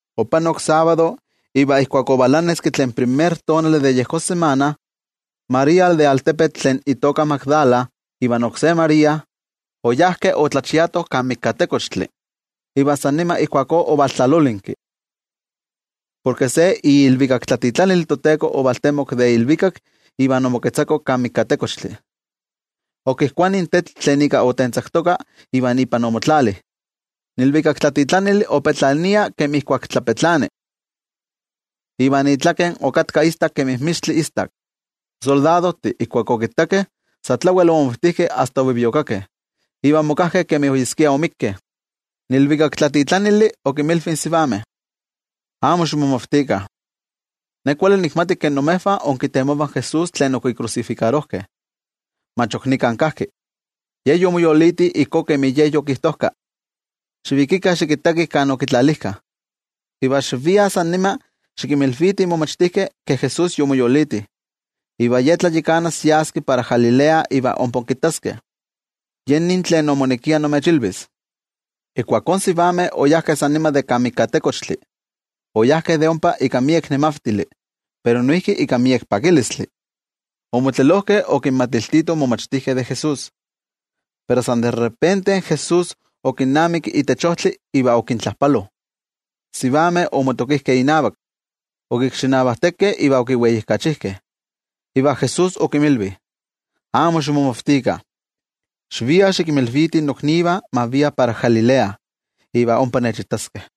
Opanok sábado, iva ijkuak ovalaneski tlen primer tonali de yejón samana, María tlen de altepetl Magdala ivan oksé María, oyajkeh otlachiatoh kan mikatekochtli. Iva san nima ijkuakó ovaltlalolinki, porke se iilvikaktlatitlanil in toTeko ovaltemok de ilvikak iva omoketzako kan mikatekochtli, okijkuani in tetl tlen ika otentzaktoka iva ipan omotlali. In ilvikaktlatitlanili opetlania kemi ijkuak tlapetlani, iva itlaken okatka istak kemi mixtli istak. In soldadojtih ijkuak okittakeh, sa tlawel omavkaviviokakeh iva omokajkeh kemi oyeskia omikkeh. In ilvikaktlatitlanili okinmilvi in sivameh: —Amo ximomavtikah. Ne kuali nikmati ke imejvah inkitemovah in Jesús tlen okikrusifikarojkeh. Mach ok nika kajki, Ye yomoyoliti ijkó kemi Ye yokijtojka. Xivikikah xikittakih kan okitlalijkah. Iva xiviah san nima xikinmilvitih in momachtijkeh ke Jesús yomoyoliti. Iva Ye tlayakanas yas para Galilea iva ompa kittaskeh. Yen nin tlen omonekia nimechilvis. Ijkuakó in sivameh oyajkeh san nima de kan mikatekochtli, oyajkeh de ompa ika miek nemavtili pero noijki ika miek pakilistli. Omotlelojkeh okinmatiltitoh in momachtijkeh de Jesús. Pero san de repente Jesús okinnamiki itech ojtli iva okintlajpalo. In sivameh omotokijkeh inavak, okikxinavajtekeh iva okiweijkachijkeh. Iva Jesús okinmilvi: —Amo ximomavtikah. Xiviah xikinmilvitih noknivah ma viah para Galilea, iva ompa nechitaskeh.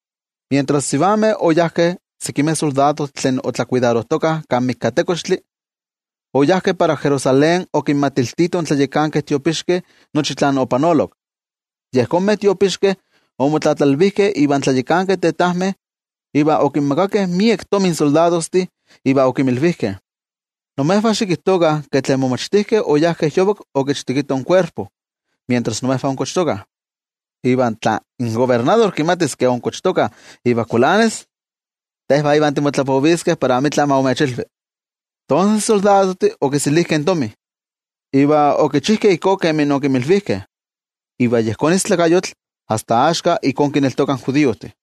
Mientras in sivameh oyajkeh, sekimeh soldadojtih tlen otlakuidarojtokah kan mikatekochtli, oyajkeh para Jerusalén okinmatiltitoh in tlayakankeh tiopixkeh nochi tlen opanolok. Yejonmeh tiopixkeh omotlatlalvijkeh ivan tlayakankeh tetajmeh, iva okinmakakeh miek tomi in soldadojtih, iva okimilvijkeh: —Imejvah xikijtokah in momachtijkeh oyajkeh yovak okichtekitoh in kuerpo, mientras imejvah onkochtokah. Iva tla in kobernador kimatis ke onkochtokah iva kualanis, tejvah ivan timotlapoviskeh para amitla ma imechilvi. Tonses in soldadojtih okiselijkeh in tomi iva okichijkeh ijkó kemi okinmilvijkeh. Iva yejón istlakayotl asta axka ijkó kineltokah in judiojtih.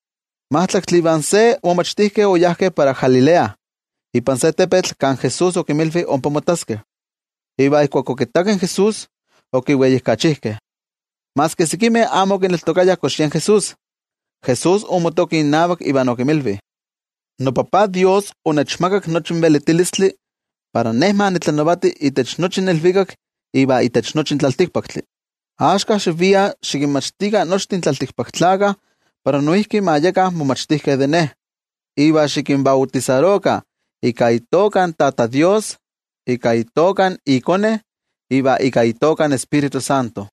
In majtlaktli ivan se momachtijkeh oyajkeh para Galilea ipan se tepetl kan Jesús okinmilvi ompa mottaskeh. Iva ijkuak okittakeh in Jesús, okiweijkachijkeh. Maski sekimeh amo okiyekneltokayah kox yen Jesús. Jesús omotoki innavak iva okinmilvi: —NoTajtzin Dios onechmakak nochi in velitilistli para Ne ma nitlanavati itech nochi in ilvikak iva itech nochi in tlaltikpaktli. Axka, xiviah iva xikinmachtikah nochtin tlaltikpaktlakah para noijki ma yekah momachtijkeh de Ne. Iva xikinbautisarokah ika itoka in Tata Dios, ika itoka iKone, iva ika itoka in Tioijyotzintli.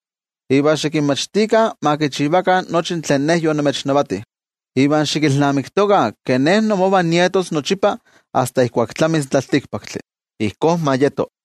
Iva xikinmachtikah ma kichivakah nochi tlen Ne yonimechnavati. Iva xikilnamiktokah ke Ne imovah nietos nochipa asta ijkuak tlamis in tlaltikpaktli. Ijkó ma yeto.